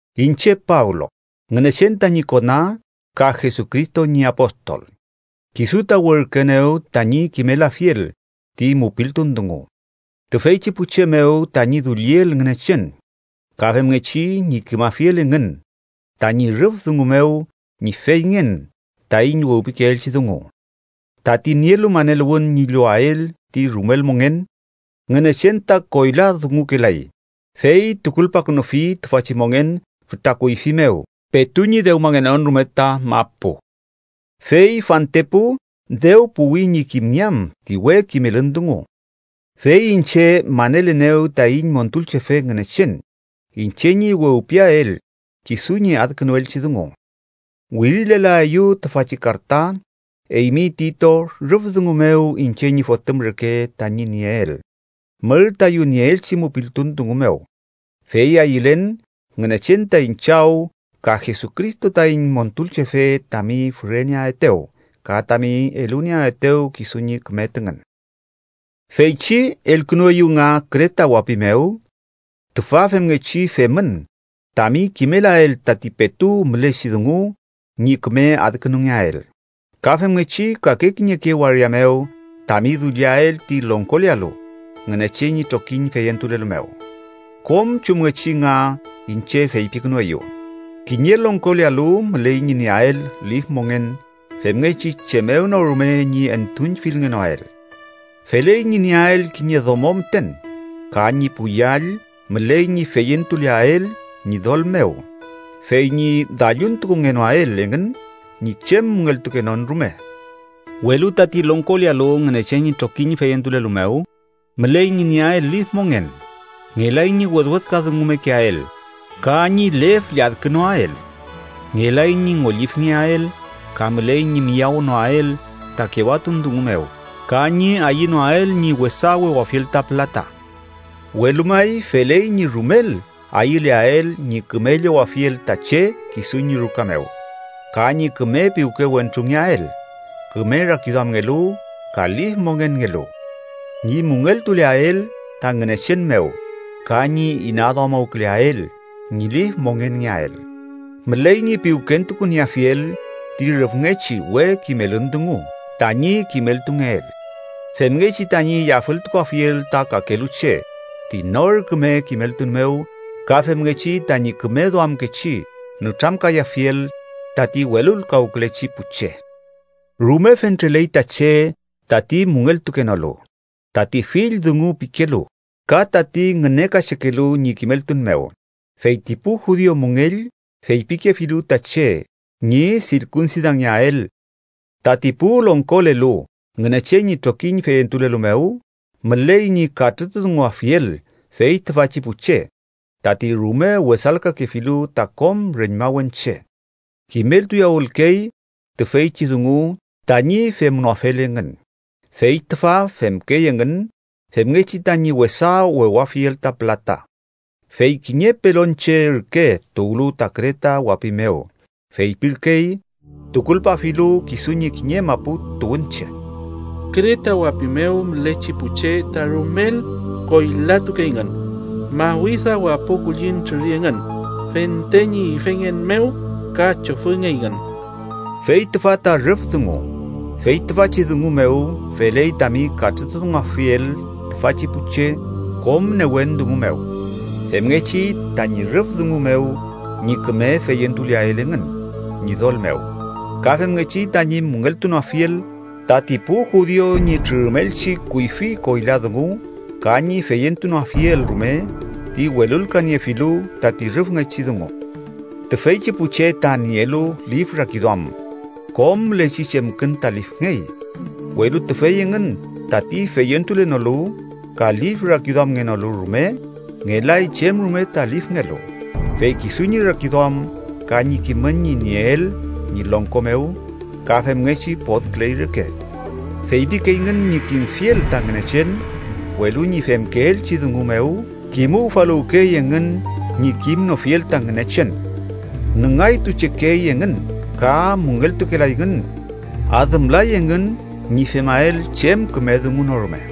Iñche Pablo, Ngünechen tañi kona ka Jesucristo ñi apostol. Kisu ta werküenew tañi kimelafiel ti mupiltun dungu tüfeychi pu che mew tañi dulliel Ngünechen, ka femngechi ñi kimafiel engün tañi rüf dungu mew ñi feyngen taiñ wewpikeelchi dungu, tati nielu maneluwün ñi llowael ti rumel mongen. Ngünechen ta koyladungukelay, fey tukulpakünufi tüfachi mongen fütra kuyfi mew petu ñi dewmangenon rume ta mapu. Fey fantepu dew puwi ñi kimngeam ti we kimelün dungu, fey iñche manelenew taiñ Montulchefe Ngünechen iñche ñi wewpiael kisu ñi adkünuelchi dungu. Wirilelaeyu tüfachi karta, eymi Tito rüf dungu mew iñche ñi fotüm reke tañi nieel mür tayu nieelchi mupiltun dungu mew, fey ayülen Ngünechen taiñ Chaw ka Jesucristo taiñ Montulchefe tami füreneaetew ka tami elunieaetew kisu ñi küme tüngün. Feychi elkünueyu nga Kreta wapi mew, tüfa femngechi femün tami kimelael tati petu mülechi dungu ñi küme adkünungeael, ka femngechi kake kiñeke waria mew tami dulliael ti longkolealu Ngünechen ñi trokiñ feyentulelu mew, kom chumngechi nga iñche feypikünueyu. Kiñe longkolealu müley ñi nieael lif mongen femngechi chem mew no rume ñi entuüñfilngenoael. Feley ñi nieael kiñe domo müten ka ñi pu yall müley ñi feyentuleael Ñidol mew fey ñi dalluntukungenoael engün ñi chem müngeltukenon rume. Welu tati longkolealu Ngünechen ñi trokiñ feyentulelu mew, müley ñi nieael lif mongen. Ngelay ñi wedwedka dungumekeael, ka ñi lef lladkünoael. Ngelay ñi ngollifengeael, ka müley ñi miyawnoael ta kewatun dungu mew, ka ñi ayünoael ñi wesa wewafiel ta pülata. Welu may, feley ñi rumel ayüleael ñi küme llowafiel ta che kisu ñi ruka mew, ka ñi küme piwke wentrungeael, küme rakiduamngelu ka lif mongenngelu, ñi müngeltuleael ta Ngünechen mew ka ñi inaduamuwküleael ñi lif mongenngeael. Müley ñi piwkentukunieafiel ti rüfngechi we kimelün dungu tañi kimeltungeel, femngechi tañi yafültukuafiel ta kakelu che ti nor küme kimeltun mew ka femngechi tañi küme duamkechi nütramkayafiel tati welulkawkülechi pu che. Rume fentreley ta che tati müngeltukenolu, tati fill dungu pikelu, ka tati ngünekachekelu ñi kimeltun mew, fey ti pu judiu müngell feypikefilu ta che ñi sirkunsidangeael. Tati pu longkolelu Ngünechen ñi trokiñ feyentulelu mew müley ñi katrütudunguafiel fey tüfachi pu che tati rume wesalkakefilu ta kom reñmawen che, kimeltuyawülkey tüfeychi dungu tañi femnoafel engün fey tüfa femkey engün femngechi tañi wesa wewafiel ta pülata. Fey kiñe pelonche ürke tuwlu ta Kreta wapi mew, feypirkey tukulpafilu kisu ñi kiñe mapu tuwünche: “Kreta wapi mew mülechi pu che ta rumel koylatukeyngün, mawida wapo kulliñ trüri engün fente ñi ifengen mew ka chofüngeyngün.” Fey tüfa ta rüf dungu. Fey tüfachi dungu mew feley tami katrütudunguafiel tüfachi pu che kom newen dungu mew, femngechi tañi rüf dungu mew ñi küme feyentuleael engün Ñidol mew. Ka femngechi tañi müngeltunoafiel tati pu judiu ñi trürümelchi kuyfi koyla dungu ka ñi feyentunoafiel rume ti welulkaniefilu tati rüfngechi dungu. Tüfeychi pu che ta nielu lif rakiduam, kom mülechi chemkün ta lifngey, welu tüfey engün tati feyentulenolu ka lif rakiduamngenolu rume, ngelay chem rume ta lifngelu, fey kisu ñi rakiduam ka ñi kimün ñi nieel ñi longko mew ka femngechi podküley reke. Feypikeyngün ñi kimfiel ta Ngünechen, welu ñi femkeelchi dungu mew kimufaluwkey engün ñi kimnofiel ta Ngünechen. Nüngaytuchekey engün ka müngeltukelayngün. Adümlay engün ñi femael chem küme dungu no rume.